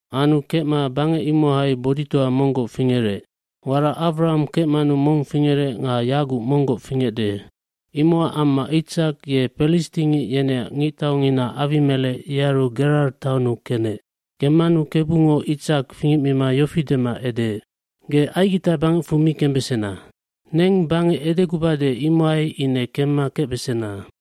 aAnu kecma bangec imohai boditoa monggoc fingerec. Warac Awraham kecmanu mong fingecma feec. Imocac amma Itsak ye pelistingic yeneac ngictaungina Awimelec yearu Gerar taonnu kenec. Kemmanu Kebungo Itsak fingecmima yofi dema edeec, “Ge Aigita bangecfu mi kembesena. Neng bangec edegubade imohai ine kemma kecbesena.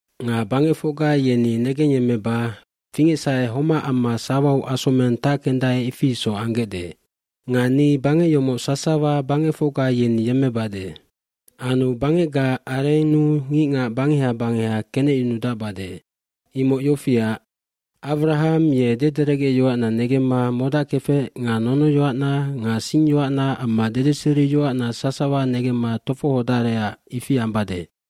cNga bangecfocga yeni negengyemmeba fingecsahe homac amma sawau asomeng tackendae ifi isoc ambesandae. Nga ni bangec yomoc sasawa bangecfocga yeni yemmebade. Anu bangecgaac arennu ngicngac bangeha bangeha kenecyunudacbesandua. Imoc yofiac, Awraham ye dederecgeyoacna negemma modackefec nga nonoyoacna nga singyoacna amma dedeseriyoacna sasawa negemma tofohodarecac ifi ambade.”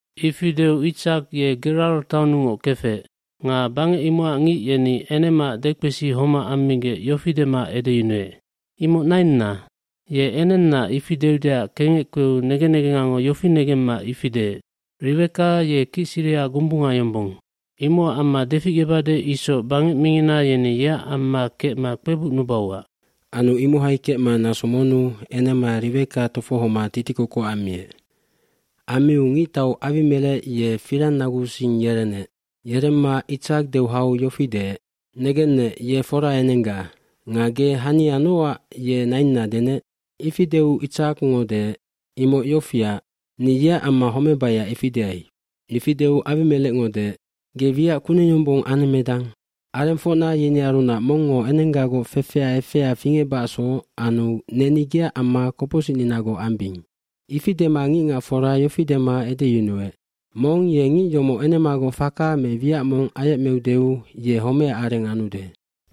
Ifi deu Itsak ye Gerar taunnungoc kefec. dNga bangec imocac ngic yeni enemaac dekpesi homac ammigec yofi dema edeyunuec, “Imoc nainna.” Ye enenna, ifi deudeac kengec kpeu negen negengango yofi negemma ifi deec. Riweka ye kicsiriha gombunga yombong. Imocac amma deficgebade isoc bangec mingina yeni yeac amma kecma kpebucnubauac. Anu imohai kecma naso monnu enema Riweka tofohoma titikokoc ammiec. Ammiu ngictau Awimelec ye firangnaguusing yerenec. Yeremma Itsak deu hau yofi deec, “Negennec, ye fora enengga. Nga ge hania nocac ye nainna denec?” Ifi deu Itsakngo deec, “Imoc yofiac, ni yeac amma homebaiac ifi deai.” Ifi deu Awimelecngo deec, “Ge wiac kuneng yombong anemmedang. Arengfocna yenearunac mongngo enenggagoc fefea efea fingecbacacsoc anu neni geac amma kopocsicninagoc ambing.” eIfi dema ngicngacfora yofi dema edeyunuec, “Mong ye ngic yomoc enemagoc faka me wiac mong ayecmeudeu ye homecac areng anude.”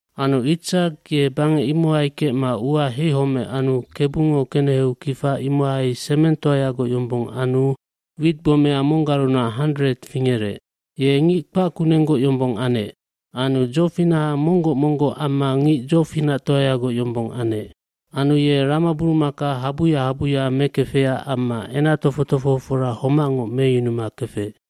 Anu Itsak ye bangec imohai kecma ua heihomec anu Kebungo keneheu kifa imohai semengtoagoc yombong anu witgbomea mocguarunac handred fingerec. Ye ngic kpac kunenggoc yombong anec. Anu dzofinaha monggoc monggoc amma ngic dzofinactoayagoc yombong anec. Anu ye ramaburumaka habuya habuya mekefecac amma enac tofoc tofohofora homacngoc meyunuma kefec.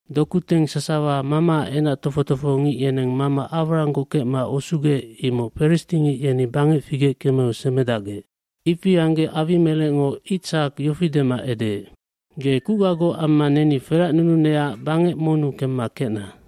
fdokuteng sasawa mamaac enac tofoc tofohongic yeneng mama Awrahamgoc kecma usugec imoc pelistingic yeni bangec figec kemeu semedacgec. Ifi anggec Awimelecngo Itsak yofi dema edeec, “Ge kucgagoc amma neni feracnununecac bangec monnu kemma kecna.”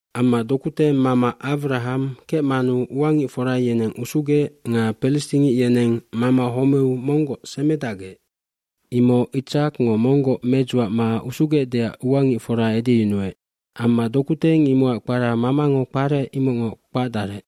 Amma dokuteng mama Awraham kecmanu uangicfora yeneng usugec nga pelistingic yeneng mama homeu monggoc semedacgec imoc Itsakngo monggoc medzuacma usugecdeac uangicfora edeyunuec. Amma dokuteng imocac kpara mamango kparec imocngoc kpacdarec.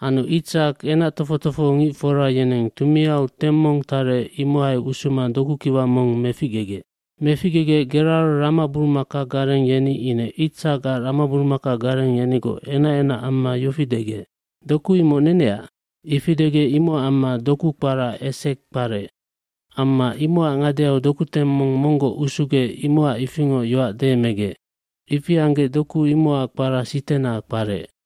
Anu Itsak enac tofoc tofohongicfora yeneng tumiau teng mong tarec imohai usuma dokukiwa mong meficgegec. Meficgegec Gerar ramaburumakagareng yeni ine Itsakac ramaburumakagareng yenigoc enacenac amma yofi degec, “Doku imoc neneac.” Ifi degec imocac amma doku kpara Esekg kparec. Amma imocac ngadeau dokuteng mong monggoc usugec imocac ifingoc yoac deemegec. Ifi anggec doku imocac kpara Sitenah kparec.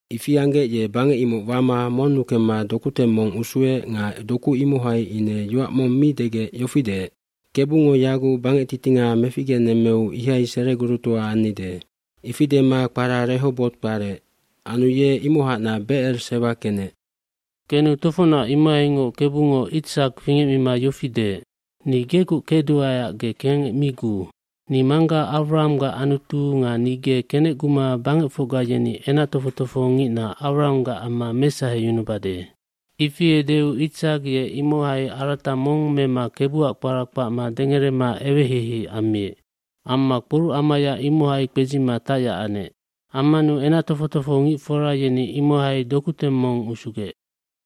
Ifi anggec ye bangec imoc wama monnu kemma dokuteng mong usuec nga doku imohai ine yoac mong mi degec yofi deec, Kebungo yaguc bangectitinga meficgenemmeu ihai seregurutoa annide.” Ifi dema kpara Rehoboti kparec. Anu ye imohacnac Becer Sewa kenec. jKenu tofocnac imohaingoc Kebungo Itsak fingecmima yofi deec, “Ni gegoc kecduaeac ge kengec mi guu. Ni mangga Awrahamgac Anutu nga ni ge kenecguma bangecfocga yeni enac tofoc tofohongicna Awrahamgac amma mesaheyunubesandua.” Ifi edeu Itsak ye imohai arata mong mema Kebuac kpara kpacma dengerema eweheihei ammiec. Amma kporucamaya imohai kpedzima tacyac anec. Ammanu enac tofoc tofohongicfora yeni imohai dokuteng mong usugec.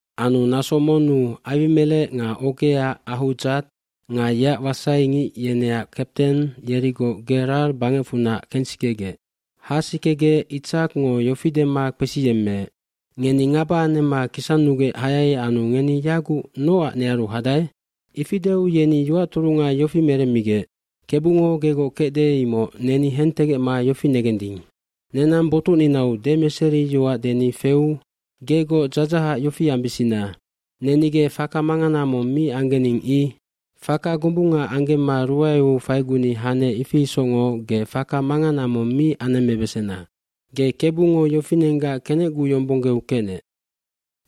kAnu naso monnu Awimelec nga ogea Ahudzat nga yeac wasaingic yeneac kapten yerigoc Gerar bangecfunac kengsikegec. Hasikegec Itsakngo yofi dema kpesiyemmeec, “Ngeni ngaba anemma kisannugec hayai anu ngeni yaguc nocac nearu hadae?” Ifi deu yeni yoac turunga yofi meremmigec, Kebungo gegoc kecde imoc neni hentegecma yofi negending. Nenang botucninau demeseriyoac deni feu gegoc dzadzahac yofi ambisina. Neni ge faka mangana mong mi anggening i. Faka gombunga anggemma ruaeu faiguni hanec ifi isocngoc ge faka mangana mong mi anemmebesena. Ge Kebungo yofinenggac kenecguyombonggeu kecnec.”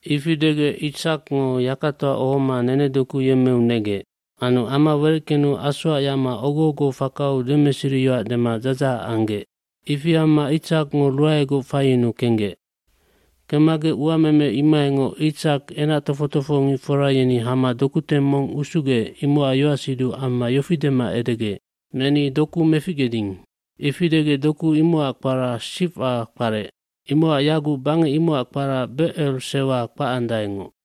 Ifi degec Itsakngo yakatoa ohoma nenedoku yemmeu negec. Anu ama wereckenu asoac yacma ogo ogoac fakau demeseriyoac dema dzadzahac anggec. Ifi amma Itsakngo ruaegoc faiyunuu kenggec. lKemmagec uameme imohaingoc Itsak enac tofoc tofohongicfora yeni hama dokuteng mong usugec imocac yoacsiduc amma yofi dema edegec, “Neni doku meficgeding.” Ifi degec doku imocac kpara Siwcam kparec. Imocac yaguc bangec imocac kpara Becer Sewan kpacandaengoc.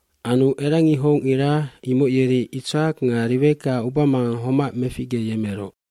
Anu erangihocngira imoc yeri Itsak nga Riweka ubamangang homac meficgeyemeroc.